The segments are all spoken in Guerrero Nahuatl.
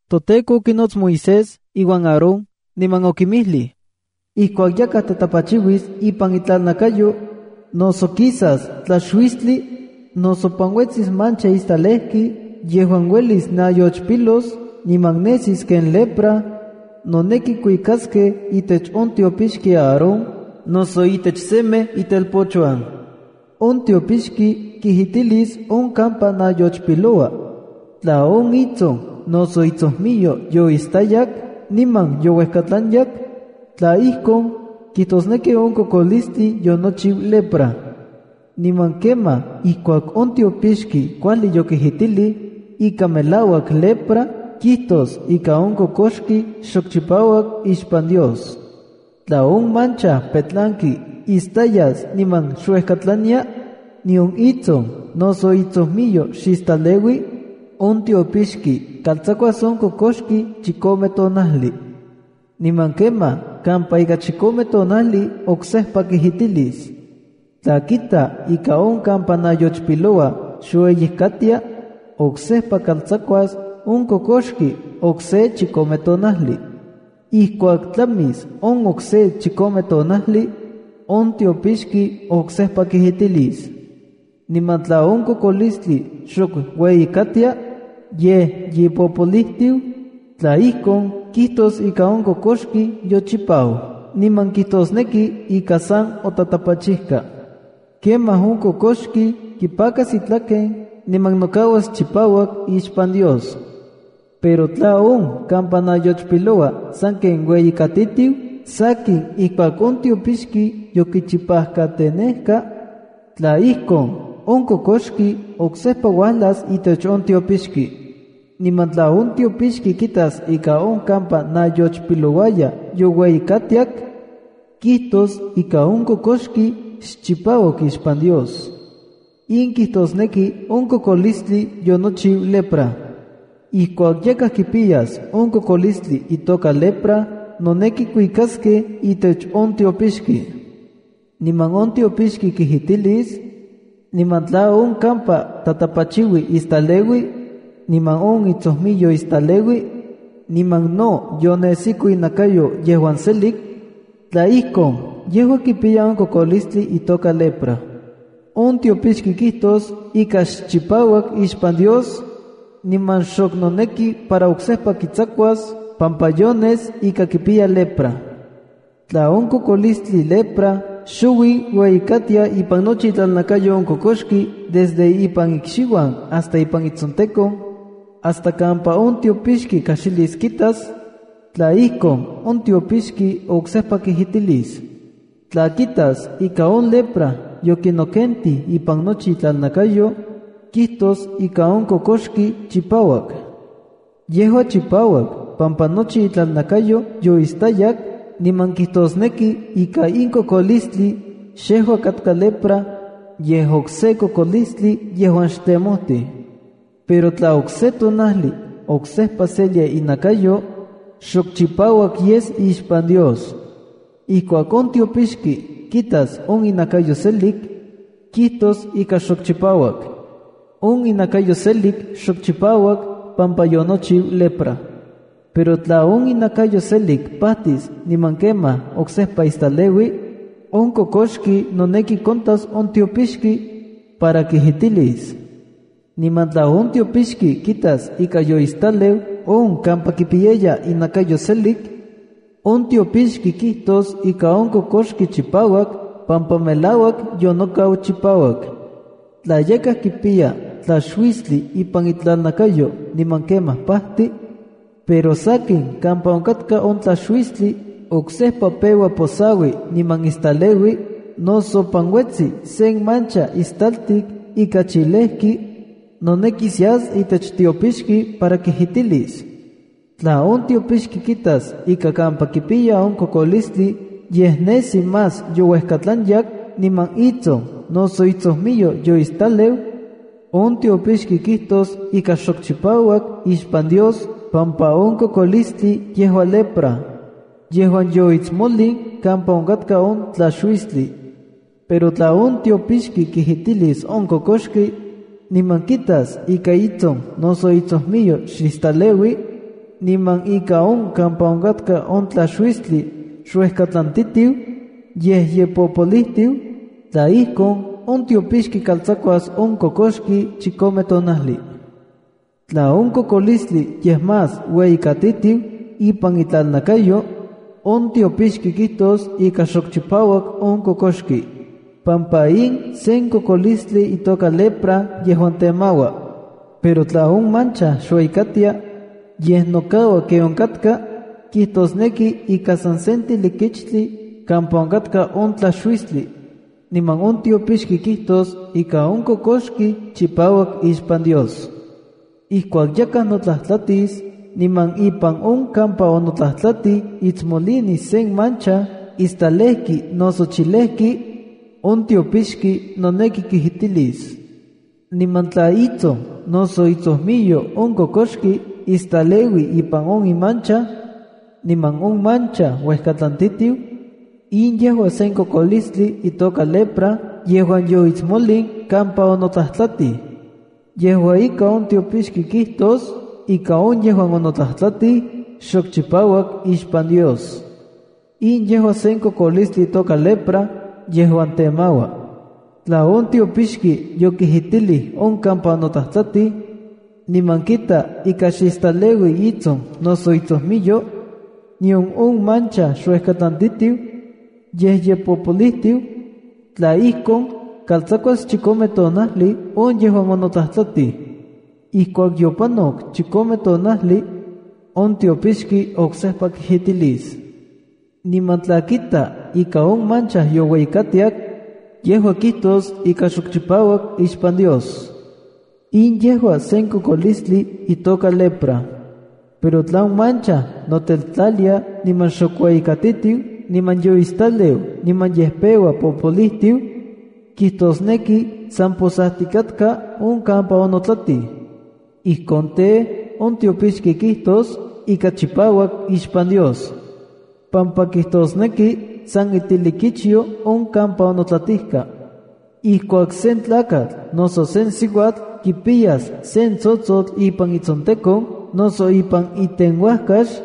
ToTEKO okinots Moisés iuan Aarón, niman okinmijlij: “Ijkuak yakaj tatapachiuis ipan itlalnakayo, noso kisas tlaxuistli, noso panuetsis mancha istalejki yejuan uelis nayochpilos niman nesis ken lepra, noneki kuikaskej itech on tiopixki Aarón noso itech semej itelpochuan. On tiopixki kijitilis on kampa nayochpiloua. Tla on itson noso itsojmiyo yoistayak niman youejkatlanyak, tla ijkon, kijtosneki on kokolistli yonochiu lepra. Niman kemaj ijkuak on tiopixki kuajli yokijitilij ika melauak lepra, kijtos ika on kokoxki xok chipauak ixpan Dios. ’Tla on mancha petlanki istayas niman xuejkatlania, nion itson noso itsojmiyo xistaleui, on tiopixki kaltsakuas on kokoxki chikome tonajli. Niman kemaj kampa ika chikome tonajli oksejpa kijitilis. Tla kita ika on kampa nayochpiloua xueyikatia, oksejpa kaltsakuas on kokoxki okse chikome tonajli. Ijkuak tlamis on okse chikome tonajli, on tiopixki oksejpa kijitilis. Niman tla on kokolistli xok ueyikatia, yej ye popolijtiu, tla ijkon, kijtos ika on kokoxki yochipau, niman kijtosneki ika san otatapachijka. Kemaj on kokoxki kipakas itlaken niman nokauas chipauak ixpan Dios. ’Pero tla on kampa nayochpiloua sanken ueyikatitiu sakin ijkuak on tiopixki yokichipajkatenejka, tla ijkon, on kokoxki oksejpa uajlas itech on tiopixki. Niman tla on tiopixki kitas ika on kampa nayochpilouaya youeyikatiak, kijtos ika on kokoxki xchipauak ixpan Dios. In kijtosneki on kokolistli yonochiu lepra. ’Ijkuak yakaj kipiyas on kokolistli itoka lepra noneki kuikaskej itech on tiopixki. Niman on tiopixki kijitilis, niman tla on kampa tatapachiui istaleui, niman on itsojmiyo istaleui, niman no yonesiko inakayo yejuan selik, tla ijkon, yejua kipiya on kokolistli itoka lepra. On tiopixki kijtos ika xchipauak ixpan Dios, niman xok noneki para oksejpa kitsakuas pampa yones ika kipiya lepra. ’Tla on kokolistli lepra xouij ueyikatia ipan nochi itlalnakayo on kokoxki desde ipan ikxiuan hasta ipan itsontekon, hasta kampa on tiopixki kajxilis kitas, tla ijkon, on tiopixki oksejpa kijitilis. Tla kitas ika on lepra yokinokentij ipan nochi itlalnakayo, kijtos ika on kokoxki chipauak. Yejua chipauak pampa nochi itlalnakayo yoistayak niman kijtosneki ika in kokolistli xejua katka lepra, yej okse kokolistli yejuan xtemojtij. Pero tla okse tonajli oksejpa selia inakayo, xok chipauak yes ixpan Dios. Ijkuak on tiopixki kitas on inakayo selik, kijtos ika xok chipauak. On inakayo selik xok chipauak pampa yonochiu lepra. ’Pero tla on inakayo selik pajtis niman kemaj oksejpa istaleui, on kokoxki noneki kontas on tiopixki, para kijitilis. Niman tla on tiopixki kitas ika yoistaleu on kampa kipiyaya inakayo selik, on tiopixki kijtos ika on kokoxki chipauak pampa melauak yonokau chipauak. ’Tla yakaj kipiya tlaxuistli ipan itlalnakayo niman kemaj pajti, pero sakin, kampa onkatka on tlaxuistli oksejpa peua posaui niman istaleui noso panuetsi sen mancha ixtaltik ika chilejki, nonekis yas itech tiopixki para kijitilis. Tla on tiopixki kitas ika kampa kipiya on kokolistli yej nesi más youejkatlanyak niman itson noso itsojmiyo yoistaleu, on tiopixki kijtos ika xok chipauak ixpan Dios pampa on kokolistli yejua lepra yejuan yoitsmolin kampa onkatka on tlaxuistli. Pero tla on tiopixki kijitilis on kokoxki, niman kitas ika itson noso itsojmiyo xistaleui, niman ika on kampa onkatka on tlaxuistli xuejkatlantitiu, yej ye popolijtiu, tla ijkon, on tiopixki kaltsakuas on kokoxki chikome tonajli. Tla on kokolistli yej más ueyikatitiu ipan itlalnakayo, on tiopixki kijtos ika xok chipauak on kokoxki, pampa in sen kokolistli itoka lepra yejuan temaua. Pero tla on mancha xueyikatia, yej nokaua ken onkatka, kitosneki ika san sen tilikichtli kampa onkatka on tlaxuistli, niman on tiopixki kijtos ika on kokoxki chipauak ixpan Dios. ’Ijkuak yakaj notlajtlatis niman ipan on kampa onotlajtlatij itsmolinis sen mancha istalejkij noso chilejki, on tiopixki noneki kijitilis. Niman tla itson noso itsojmiyo on kokoxki istaleui ipan on imancha, niman on mancha uejkatlantitiu, in yejua sen kokolistli itoka lepra yejuan yoitsmolin kampa onotlajtlatij. Yejua ika, on tiopixki kijtos ika on yejuan onotlajtlatij xok chipauak ixpan Dios. In yejua sen kokolistli itoka lepra yejuan temaua. Tla on tiopixki yokijitilij on kampa onotlajtlatij, niman kita ika xistaleui itson noso itsojmiyo, nion on mancha xuejkatlantitiu, yej ye popolijtiu, tla ijkon, kaltsakuas chikome tonajli on yejuan onotlajtlatij. Ijkuak yopanok chikome tonajli on tiopixki oksejpa kijitilis. Niman tla kita ika on mancha youeyikatiak, yejua kijtos ika xok chipauak ixpan Dios. In yejua sen kokolistli itoka lepra. Pero tla on mancha noteltlalia niman xok ueyikatitiu niman yoistaleu niman yej peua popolijtiu, kijtosneki san posajtikatka on kampa onotlatij. Ijkon tej, on tiopixki kijtos ika chipauak ixpan Dios, pampa kijtosneki san itilikichyo on kampa onotlatijka. ’Ijkuak sen tlakatl noso sen siuatl kipiyas sen mancha ipan itsontekon noso ipan itenuajkax,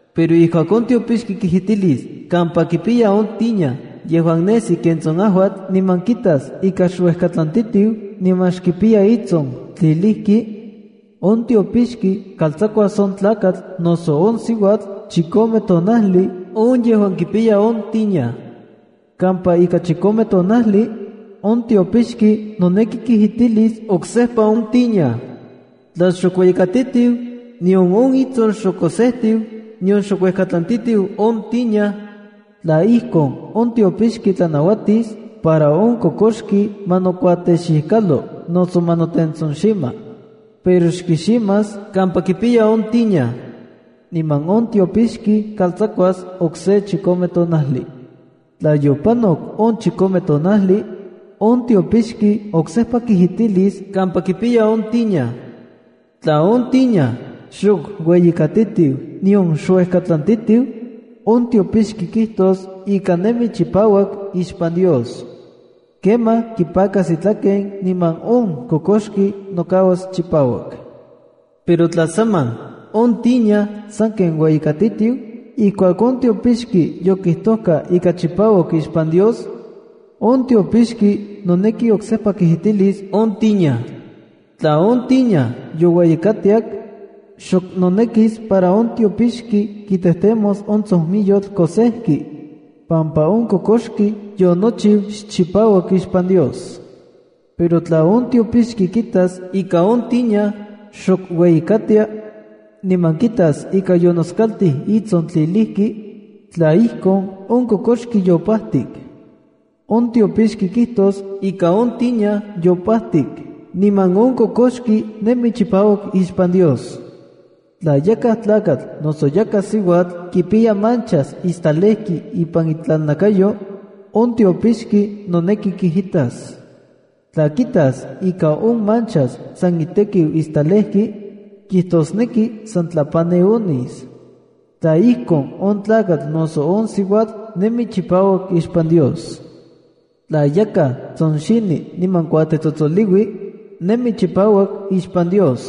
Pero ijkuak on tiopixki kijitilis kampa kipiya on tiña, niman kitas ika xuejkatlantitiu niman xkipiya itson tlilijki, on tiopixki kaltsakuas on tlakatl noso on siuatl chikome tonajli on yejuan kipiya on tiña. Kampa ika chikome tonajli, on tiopixki noneki kijitilis oksejpa on tiña. Tla xok ueyikatitiu, nion on itson xok kosejtiu, nion xuejkatlantitiu on tiña, tlaj ijkon, on tiopixki tlanauatis para on kokoxki ma nokuatexikalo noso ma notentsonxima. Pero xkiximas kampa kipiya on tiña. Niman on tiopixki kaltsakuas okse chikome tonajli. Tla yopanok on chikome tonajli, on tiopixki oksejpa kijitilis kampa kipiya on tiña. Tla on tiña xok ueyikatitiu nion xuejkatlantitiu, on tiopixki kijtos ika nemi chipauak ixpan Dios. Kemaj kipakas itlaken niman on kokoxki nokauas chipauak. Pero tla saman, on tiña sanken ueyikatitiu ijkuak on tiopixki yokijtojka ika chipauak ixpan Dios, on tiopixki noneki oksejpa kijitilis on tiña. Tla on tiña youeyikatiak, xok nonekis para on tiopixki kitejtemos on tsonmiyotl kosejki, pampa on kokoxki yonochiu xchipauak ixpan Dios. Pero tla on tiopixki kitas ika on tiña xok ueyikatia, niman kitas ika yonoskaltij itson tlilijki, tla ijkon, on kokoxki yopajtik. On tiopixki kijtos ika on tiña yopajtik niman on kokoxki nemi chipauak ixpan Dios. ’Tla yakaj tlakatl noso yakaj siuatl kipiya manchas istalejki ipan itlalnakayo, on tiopixki noneki kijitas. Tla kitas ika on manchas san itekiu istalejki, kijtosneki san tlapani ones. Tla ijkon, on tlakatl noso on siuatl nemi chipauak ixpan Dios. ’Tla yakaj tsonxini niman kuatetsotsoliui, nemi chipauak ixpan Dios.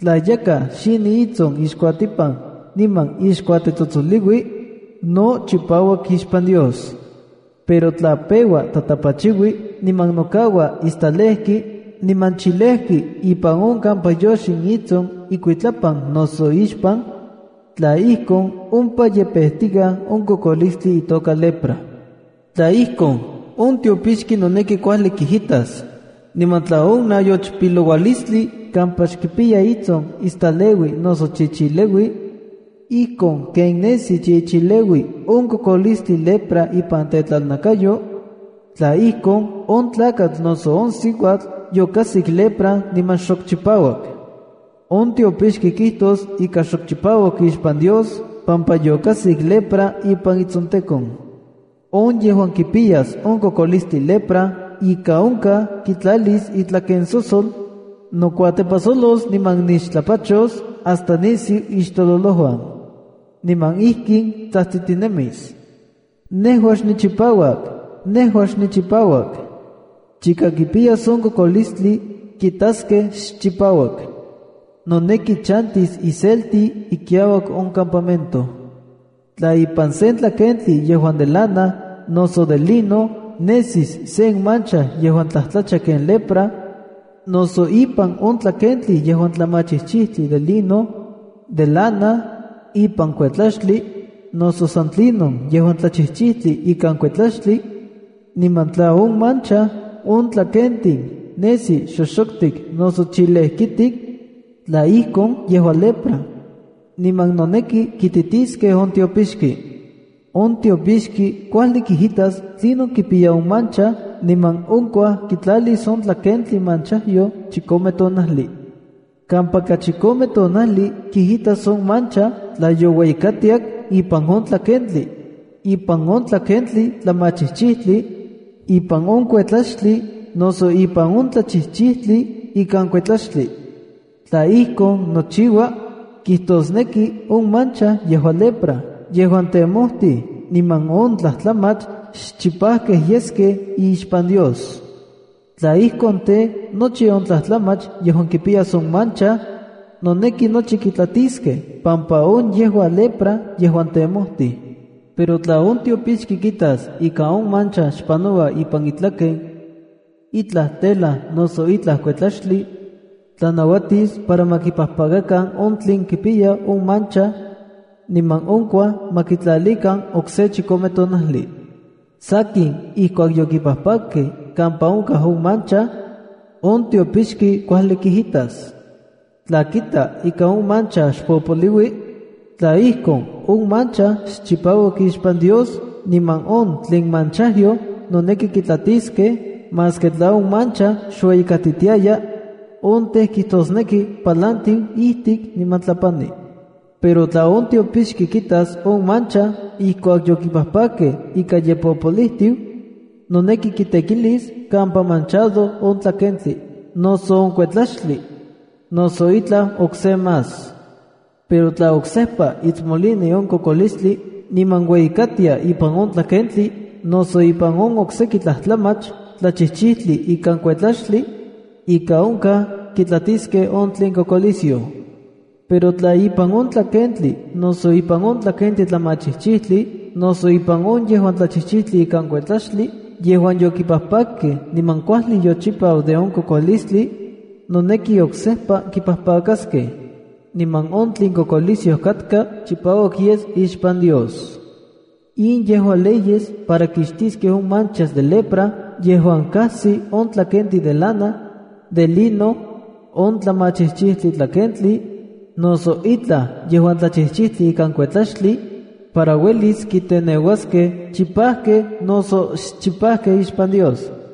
Tla yakaj xini itson ixkuatipan niman ixkuatetsotsoliui, no chipauak ixpan Dios. Pero tla peua tatapachiui niman nokaua istalejki niman chilejki ipan on kampa yoxin itson ikuitlapan noso ixpan, tla ijkon, ompa yepejtikaj on kokolistli itoka lepra. Tla ijkon, on tiopixki noneki kuajli kijitas. Niman tla on nayochpiloualistli kampa xkipiya itson istaleui noso chichileui, ijkon ken nesi chichileui on kokolistli lepra ipan tetlalnakayo, tla ijkon, on tlakatl noso on siuatl yokajsik lepra niman xok chipauak. On tiopixki kijtos ika xok chipauak ixpan Dios pampa yokajsik lepra ipan itsontekon. ’On yejuan kipiyas on kokolistli lepra ika onkaj kitlalis itlakensosol, nokuatepajsolos niman nixtlapachos hasta nisiu ixtololouan. Niman ijkin tsajtsitinemis: ¡Nejua xnichipauak! ¡Nejua xnichipauak! Chika kipiyas on kokolistli, kitaskej xchipauak. Nonekis chantis iselti ikiauak on campamento. ’Tla ipan sen tlakentli yejuan de lana noso de lino nesis sen mancha yejuan tlajtlacha ken lepra, noso ipan on tlakentli yejuan tlamachijchijtli de lino, de lana, ipan kuetlaxtli, noso san tlinon yejuan tlachijchijtli ikan kuetlaxtli, niman tla on mancha on tlakentin nesi xoxoktik noso chilejkitik, tla ijkon, yejua lepra, niman noneki kititiskej on tiopixki. On tiopixki kuajli kijitas tlinon kipiya on mancha niman onkuaj kitlalis on tlakentli manchajyoj chikome tonajli. Kampa ka chikome tonajli kijitas on mancha tla youeyikatiak ipan on tlakentli, ipan on tlakentli tlamachijchijtli, ipan on kuetlaxtli noso ipan on tlachijchijtli ikan kuetlaxtli. Tla ijkon nochiua, kijtosneki on mancha yejua lepra yejuan temojtij niman on tlajtlamach xchipajkej yeskej ixpan Dios. Tla ijkon tej, nochi on tlajtlamach yejuan kipiyas on mancha, noneki nochi kitlatiskej pampa on yejua lepra yejuan temojtij. Pero tla on tiopixki kitas ika on mancha xpanoua ipan itlaken, itlaj tela noso itlaj kuetlaxtli, tlanauatis para ma kipajpakakan on tlen kipiya on mancha, niman onkuaj ma kitlalikan okse chikome tonajli. ’Sankin ijkuak yokipajpakkej kampa onkaj on mancha, on tiopixki kuajli kijitas. Tla kita ika on mancha xpopoloui, tla ijkon, on mancha xchipauak ixpan Dios niman on tlen manchajyoj noneki kitlatijskej maski tla on mancha xueyikatitiaya, on tej kijtosneki palantiu ijtik niman tlapani. Pero tla on tiopixki kitas on mancha ijkuak yokipajpakkej ika ye popolijtiu, noneki kitekilis kampa manchado on tlakentli, noso on kuetlaxtli; noso itlaj okse más. Pero tla oksepa itsmolini on kokolistli niman ueyikatia ipan on tlakentli noso ipan on okseki tlajtlamach tlachijchijtli ikan kuetlaxtli, ika onkaj kitlatiskej on tlen kokolisyoj. Pero tla ipan on tlakentli noso ipan on tlakentli tlamachijchijtli noso ipan on yejuan tlachijchijtli ikan kuetlaxtli yejuan yokipajpakkej niman kuajli yochipau de on kokolistli, noneki oksejpa kipajpakaskej, niman on tlen kokolisyoj katka chipauak yes ixpan Dios.” In yejua leyes para kixtiskej on manchas de lepra yejuan kajsi on tlakentin de lana, de lino, on tlamachijchijtli tlakentli, noso itlaj yejuan tlachichijtli ikan kuetlaxtli, para uelis kinteneuaskej chipajkej noso xchipajkej ixpan Dios.